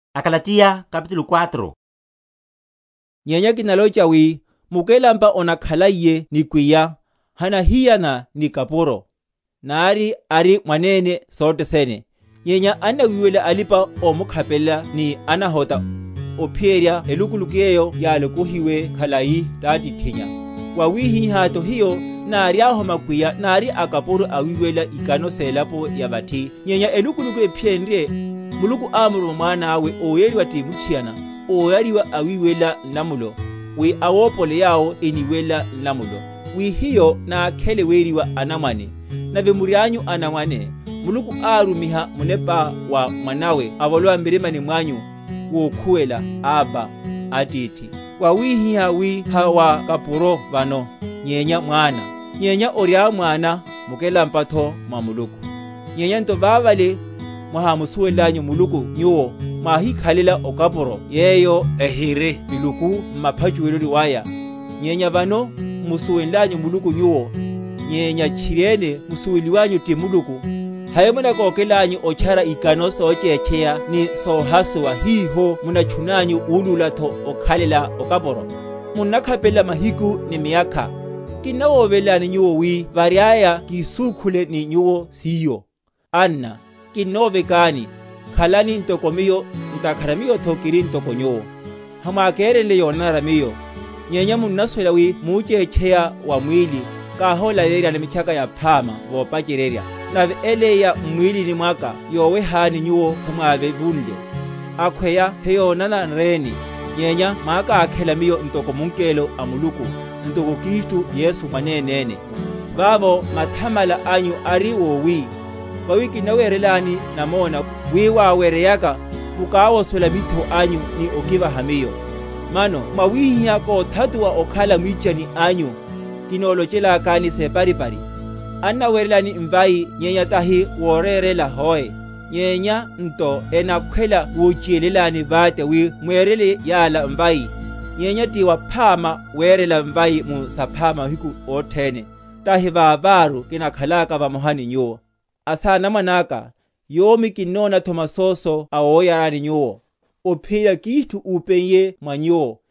Mitchaka Yaphama on’taphula waya hiyo o malamulo. Nyenya kinalocha wi, mukelampa onakhaliye nikwiya, hanahiyana ni kapuro, nari ari mwanene sothe sene; nyenya annawiwelela alipa‐omukhapelela ni anahota, ophiyerya elukuluku yeyo yálokohiwe khalai tátithinnya. Wawihihátho hiyo, náriahu makwiya, nári akapuro awiwelela‐ikano selapo ya vathi; nyenya elukuluku ephiyenrye, Muluku ámuruma Mwana awe, óyariwa ti muthiana, óyariwa awiwelela nlamulo, wi awopole yawo eniwelela nlamulo, wi hiyo nákhele weriwa anamwane. Nave murianyu anamwane, Muluku árumiha Munepa wa Mwanáwe avolowe m’mirima mwanyu, wokhuwela, Abba, Atithi. Mwawihihá wi ha wa kapuro vano, nyenya mwana; nyenyu oriá mwana, mukelampatho mwa Muluku. Nyenya nto vavale, mwahámusuwenlanyu Muluku nyuwo, mwáhíkhalela okapuro yeyo ehiri miluku mupachushiwa waya; nyenya vano, m’musuwenlanyu Muluku nyuwo, nyenya tchiriene musuweliwanyu ti Muluku, hai munakókelanyu otchara ikano sochétcheya ni sohasuwa, hiho munatchunanyu wulúlatho okhalela okapuro? Munnakhapelela mahiku, ni miyakha. Kinnawovelani nyuwo, wi variaya kisúkhunle ni nyuwo siyo. Anna, kinnovekani, khalani ntoko miyo, ntakhara miyotho kiri ntoko nyuwo. Hamwákerenle yonanara miyo; nyenya munnasuwela wi muchétcheya wa mwíli káhólaleyeryani Mitchaka Yaphama vopacheryerya: nave ele ya m’mwílini mwaka yowehani nyuwo hemwávevunle; akhweya heyónananreni, nyenya mwákákhela miyo ntoko mungelo a Muluku, ntoko Kristu Yesu mwanenéne. Vavo mathamala anyu ari wowi? Vawi kinnawerelani namona, wi, wáweryeya, mukáwosola mitho anyu ni okivaha miyo. Mano mwawihihá kóthatuwa okhala mwichani anyu, kinolochelakani separipari? Annawerelani mvai nyenya tahi morérela hoe, nyenya nto enakhwela wochiyelelani vate, wi mwerele yala mvai. Nyenya ti waphama werela mvai mu saphama mahiku othene, tahi vaváru kinakhalaka vamoha ni nyuwo. Asanamwane aka, yomi kinónatho masoso awoyarani nyuwo, ophiyerya Kristu úpeiye mwa nyuwo,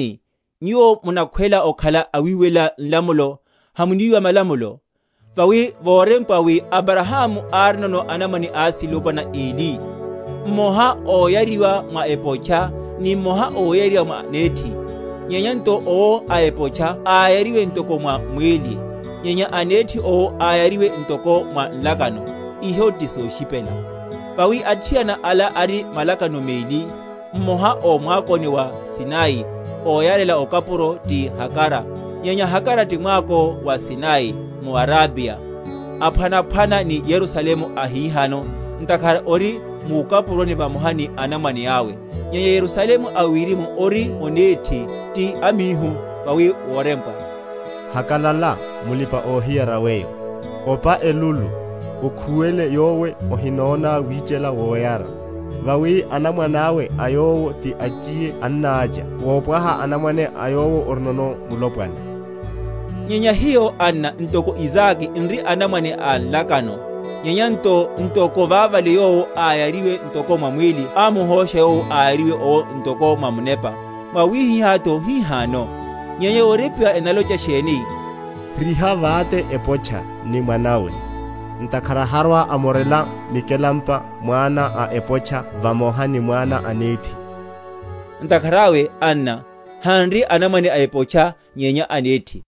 Kiléleni, nyuwo munakhwela okhala awiwelela nlamulo, hamuníwa malamulo? Vawi vorempwa, wi Abrahamu árinono anamwane asilopwana eli, mmoha óyariwa mwa epotcha, ni mmoha óyariwa mwa nethi. Nyenya nto owo a epotcha áyariwe ntoko mwa mwíli; nyenya a nethi owo, áyariwe ntoko mwa nlakano. Iho ti soshipela. Vawi athiana ala ari malakano meli, mmoha ó mwakoni wa Sinai, óyarela okapuro, ti Hagara. Nyenya Hagara ti mwako wa Sinai, muArabiya, aphwanaphwana ni Yerusalemu ahihano; ntakhara ori mukapuroni vamoha ni anamwane awe. Nyenya Yerusalemu a wirimu ori onethi, ti amíhu. Vawi worempwa. Hakalala, mulipa‐ohiyara weyo; Opa elulu, okhuwele yowe ohinóna wichela woyara; Vawi anamwane awe a yowo ti achiye ennácha wopwaha anamwane a yowo orinono mulopwana. Nyenya hiyo, anna, ntoko Isake, n’ri anamwane a nlakano. Nyenya nto ntoko vavale yowo áyariwe ntoko mwa mwíli ámuhósha yowo áyariwe owo ntoko mwa Munepa, mwawihihátho hihano. Nyenya yorempwa enalocha sheni? Riha vate epotcha ni mwana awe, ntakhara harwa‐amorela mikelampa mwana a epotcha vamoha ni mwana a nethi. Ntakhara awe, anna, hanri anamwane a epotcha, nyenya a nethi.